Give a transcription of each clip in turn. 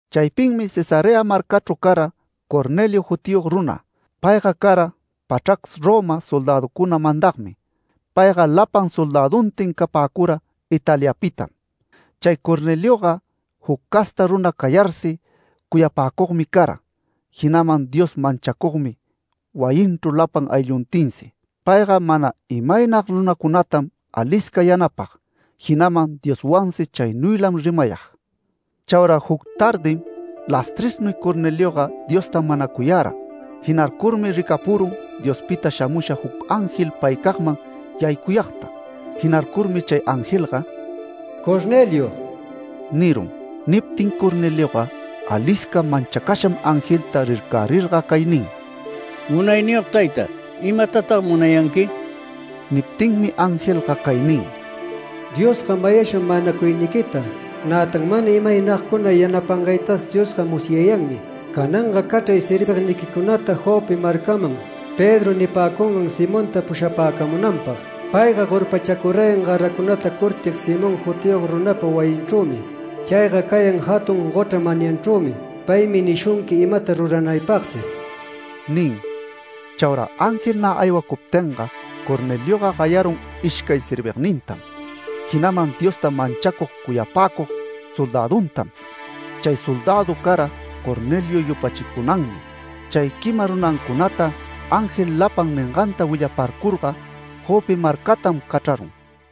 Chaypinmi Cesarea marcachru cara Cornelio jutiyog runa. Payga cara pachrac Roma soldäducuna mandagmi. Payga lapan soldäduntin capäcura Italiapitam. Chay Cornelioga, juc casta runa cayarsi, cuyapäcugmi cara, jinaman Dios manchacugmi wayinchru lapan aylluntinsi. Payga mana imaynag runacunatam alisca yanapag, jinaman Dioswansi chaynuylam rimayag. Chaura juc tardim lastresnuy Cornelioga Diosta manacuyara. Jinarcurmi ricapurun Diospita shamusha juc ángel paycagman yaycuyagta. Jinarcurmi chay angelga “Cornelio” nirun. Niptin Cornelioga alisca manchacasham angelta rircärirga cay nin: “Munayniyog tayta, ¿imatatag munayanqui?” Niptinmi angelga cay nin: “Diosga mayasham manacuyniquita, nätan mana imaynagcuna yanapangaytas Diosga musyayanmi. Cananga cachray servigniquicunata Jope marcaman, Pedro nipäcungan Simonta pushapäcamunanpag. Payga gorpachacurayan garacunata curtig Simón jutiyog runapa wayinchrümi. Chayga cayan jatun gochra manyanchrümi. Paymi nishunqui imata ruranaypagsi” nin. Chaura ángel nä aywacuptinga Cornelioga gayarun ishcay servignintam, jinaman Diosta manchacug cuyapäcug soldäduntam. Chay soldädu cara Cornelio yupachicunanmi. Chay quima runancunata ángel lapan ninganta willaparcurga Jope marcatam cachrarun.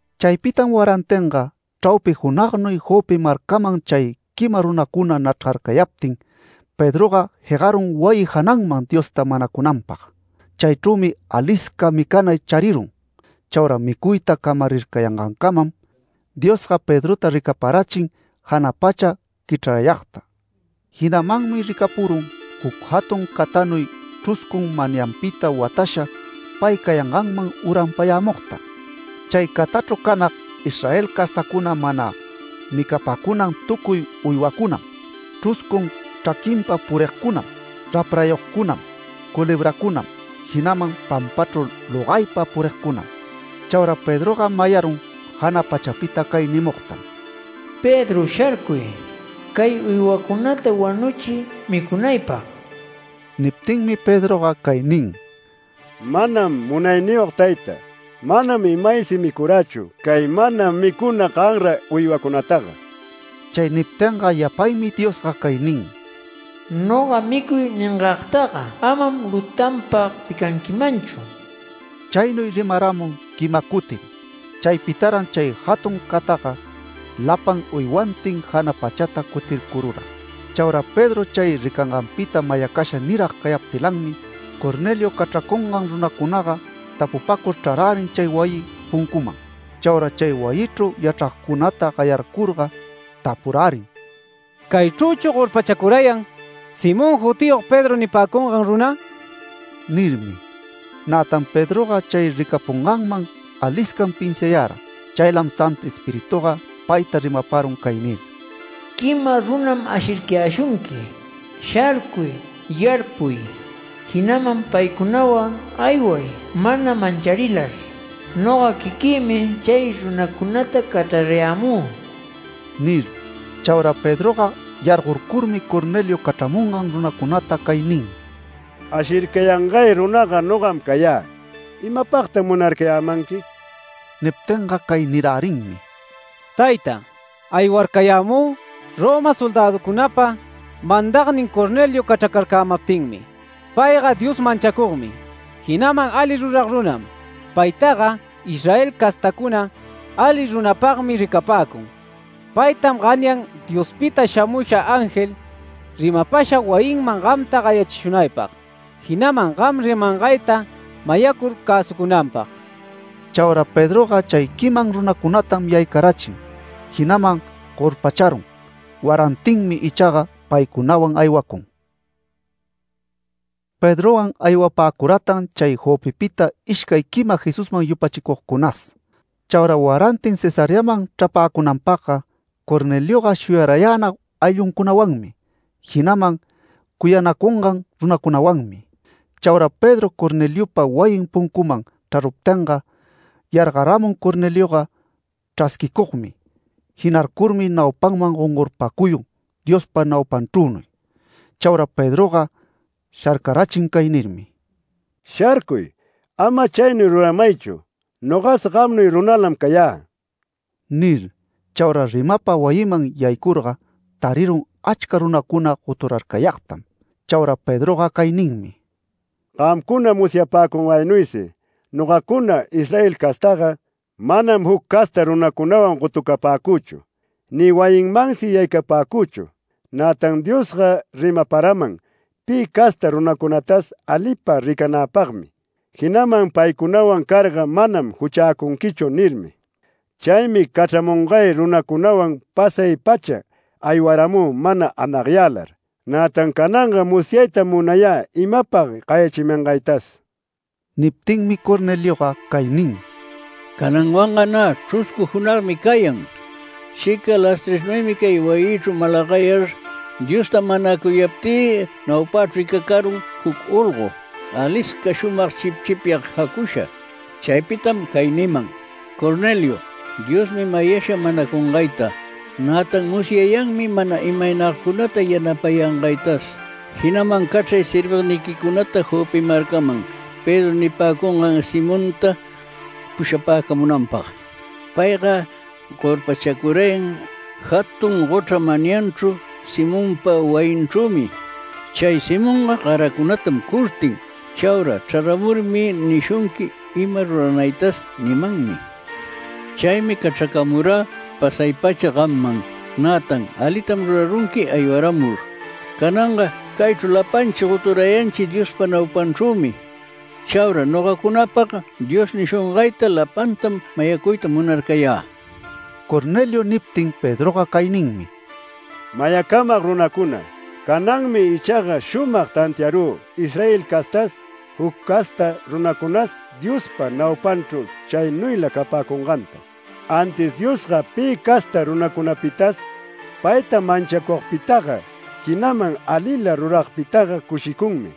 Chaypitam warantinga chraupi junagnuy Jope marcaman chay quima runacuna nachrgarcayaptin, Pedroga jegarun wayi jananman Diosta manacunanpag. Chaychrümi alisca micanay charirun. Chaura micuyta camarircayangancamam Diosga Pedrota ricaparachin jana pacha quichrarayagta. Jinamanmi ricapurun juc jatun catanuy chruscun manyanpita watasha pay cayanganman uranpayämugta. Chay catachru canag Israel castacuna mana micapäcunan tucuy uywacunam, chruscun chraquinpa purigcunam, raprayogcunam, culebracunam, jinaman pampachru logaypa purigcunam. Chaura Pedroga mayarun jana pachapita cay nimugtam: “Pedro, sharcuy, cay uywacunata wanuchiy micunaypag”. Niptinmi Pedroga cay nin: “Manam Munayniyog tayta. Manam imaysi micurächu cay mana micuna ganra uywacunataga”. Chay niptinga yapaymi Diosga cay nin: “Noga ‘Micuy’ ningagtaga amam lutanpag ricanquimanchu”. Chaynuy rimaramun quima cutim. Chaypitaran chay jatun cataga lapan uywantin jana pachata cutircurura. Chaura Pedro chay ricanganpita mayacasha nirag cayaptilanmi, Cornelio cachracungan runacunaga tapupacur chrarärin chay wayi puncuman. Chaura chay wayichru yachragcunata gayarcurga tapurärin: “¿Caychrüchu gorpachacurayan Simón jutiyog, Pedro nipäcungan runa?” nirmi. Nätan Pedroga chay ricapunganman aliscam pinsiayara. Chaylam Santu Espirituga payta rimaparun cay nir: “Quima runam ashircayäshunqui. Sharcuy, yarpuy, jinaman paycunawan ayway mana mancharilar. Noga quiquïmi chay runacunata cachrarayämü” nir. Chaura Pedroga yargorcurmi Cornelio cachramungan runacunata cay nin: “Ashircayangay runaga nogam cayä. ¿Imapagtag munarcayämanqui?” Niptinga cay nirärinmi: “Tayta, aywarcayämü Roma soldäducunapa mandagnin Cornelio cachracarcämaptinmi. Payga Dios manchacugmi, jinaman ali rurag runam. Paytaga Israel castacuna ali runapagmi ricapäcun. Paytam ganyan Diospita shamusha ángel rimapasha wayinman gamta gayachishunaypag, jinaman gam rimangayta mayacur cäsucunanpag”. Chaura Pedroga chay quiman runacunatam yaycarachin, jinaman gorpacharun. Warantinmi ichaga paycunawan aywacun. Pedrowan aywapäcuratan chay Jopepita, ishcay quima Jesusman yupachicugcunas. Chaura warantin Cesareaman chrapäcunanpagga Cornelioga shuyarayänag aylluncunawanmi, jinaman cuyanacungan runacunawanmi. Chaura Pedro Corneliopa wayin puncuman chraruptinga, yargaramun Cornelioga chrasquicugmi. Jinarcurmi naupanman gongorpacuyun Diospa naupanchrünuy. Chaura Pedroga sharcarachin cay nirmi: “¡Sharcuy! ¡Ama chaynuy ruramaychu! Nogas gamnuy runalam cayä” nir. Chaura rimapa wayiman yaycurga tarirun achca runacuna goturarcayagtam. Chaura Pedroga cay ninmi: “Gamcuna musyapäcungaynuysi nogacuna Israel castaga, manam juc casta runacunawan gotucapäcüchu ni wayinmansi yaycapäcüchu. Nätan Diosga rimaparaman pi casta runacunatas alipa ricanäpagmi, jinaman paycunawan carga manam juchäcunquichu nirmi. Chaymi cachramungay runacunawan pasay-pacha aywaramü mana anagyälar, nätan cananga musyaytam munayä imapag gayachimangaytas”. Niptinmi Cornelioga cay nin: “Cananwanga nä chruscu junagmi cayan. Chica lastresnuymi cay wayïchru malagayar Diosta manacuyaptï naupächru ricacarun juc olgo, alisca shumag chipchipyag jacusha. Chaypitam cay niman: ‘Cornelio, Diosmi mayasha manacungayta, nätan musyayanmi mana imaynagcunata yanapayangaytas. Jinaman cachray servigniquicunata Jope marcaman Pedro nipäcungan Simonta pushapäcamunanpag. Payga gorpachacurayan jatun gochra manyanchru Simonpa wayinchrümi. Chay Simonga garacunatam curtin. Chaura chraramurmi nishunqui ima ruranaytas’ nimanmi. Chaymi cachracamurä pasay-pacha gamman. Nätan alitam rurarunqui aywaramur. Cananga caychru lapanchi goturayanchi Diospa naupanchrümi. Chaura nogacunapag Dios nishungayta lapantam mayacuyta munarcayä”. Cornelio niptin Pedroga cay ninmi: “Mayacamag runacuna: Cananmi ichaga shumag tantiarü Israel castas, juc casta runacunas Diospa naupanchru chaynuyla capäcunganta. Antis Diosga pi casta runacunapitas payta manchacugpitaga, jinaman alila ruragpitaga cushicunmi.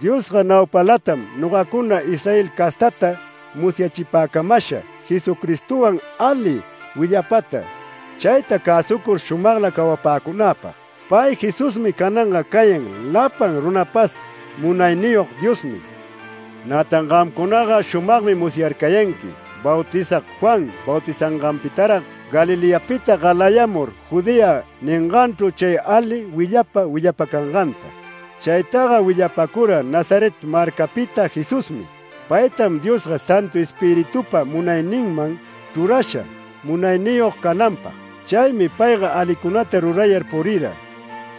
Diosga naupalatam nogacuna Israel castata musyachipäcamasha Jesucristowan ali willapata, chayta cäsucur shumagla cawapäcunäpag. Pay Jesusmi cananga cayan lapan runapas Munayniyog Diosnin. Nätan gamcunaga shumagmi musyarcayanqui Bautizag Juan bautizanganpitarag Galileapita galayamur Judea ninganchru chay ali willapa willapacanganta. Chaytaga willapacura Nazaret marcapita Jesusmi. Paytam Diosga Santu Espiritupa munayninman chrurasha munayniyog cananpag. Chaymi payga alicunata rurayar purira,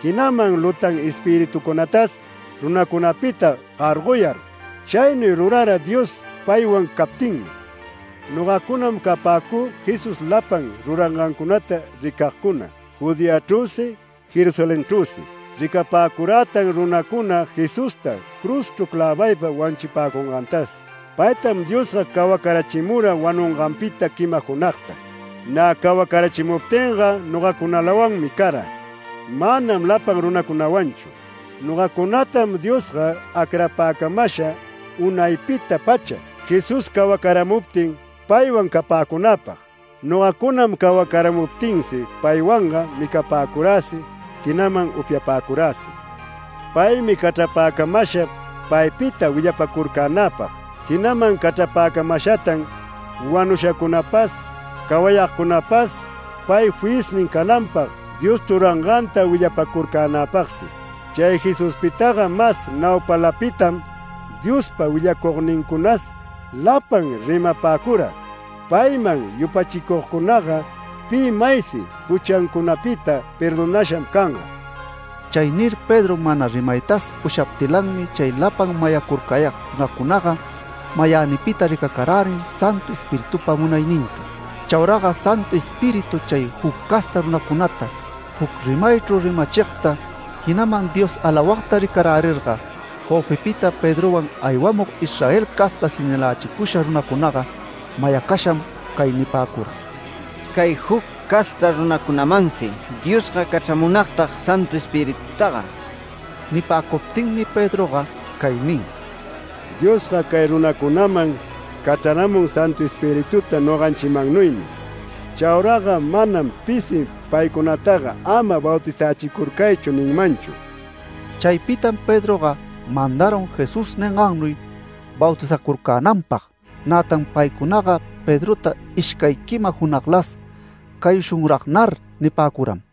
jinaman lutan espiritucunatas runacunapita gargoyar. Chaynuy rurara Dios paywan captinmi. Nogacunam capäcü Jesús lapan rurangancunata ricagcuna, Judeachrüsi Jerusalenchrüsi. Ricapäcurätan runacuna Jesusta cruzchru clävaypa wanuchipäcungantas. Paytam Diosga cawacarachimura wanunganpita quima junagta. Nä cawarachimuptinga nogacunalawanmi cara, manam lapan runacunawanchu. Nogacunatam Diosga acrapäcamasha unaypita-pacha Jesús cawacaramuptin paywan capäcunäpag. Nogacunam cawacaramuptinsi paywanga micapäcuräsi, jinaman upyapäcuräsi. Paymi cachrapäcamasha paypita willapacurcänäpag, jinaman cachrapäcamashatan wanushacunapas, cawayagcunapas pay fiyisnin cananpag Dios chruranganta willapacurcänäpagsi. Chay Jesuspitaga mas naupalapitam Diospa willacugnincunas lapan rimapäcura: ‘Payman yupachicugcunaga pi maysi juchancunapita perdonasham canga’”. Chay nir Pedro mana rimaytas ushaptilanmi chay lapan mayacurcayag runacunaga mayänipita ricacarärin Santu Espiritupa munayninchru. Chauraga Santu Espíritu chay juc casta runacunata juc rimaychru rimachigta, jinaman Dios alawagta ricarärirga Jopepita Pedrowan aywamug Israel casta señalächicusha runacunaga mayacasham cay nipäcura: “Cay juc casta runacunamansi Diosga cachramunagtag Santu Espiritutaga”. Nipäcuptinmi Pedroga cay nin: “Diosga cay runacunaman cachraramun Santu Espirituta noganchimannuymi. Chauraga manam pisi paycunataga ‘Ama bautizächicurcaychu’ ninmanchu”. Chaypitam Pedroga mandarun Jesús ningannuy bautizacurcänanpag. Nätan paycunaga Pedrota ishcay quima junaglas “Cayushunragnar” nipäcuram.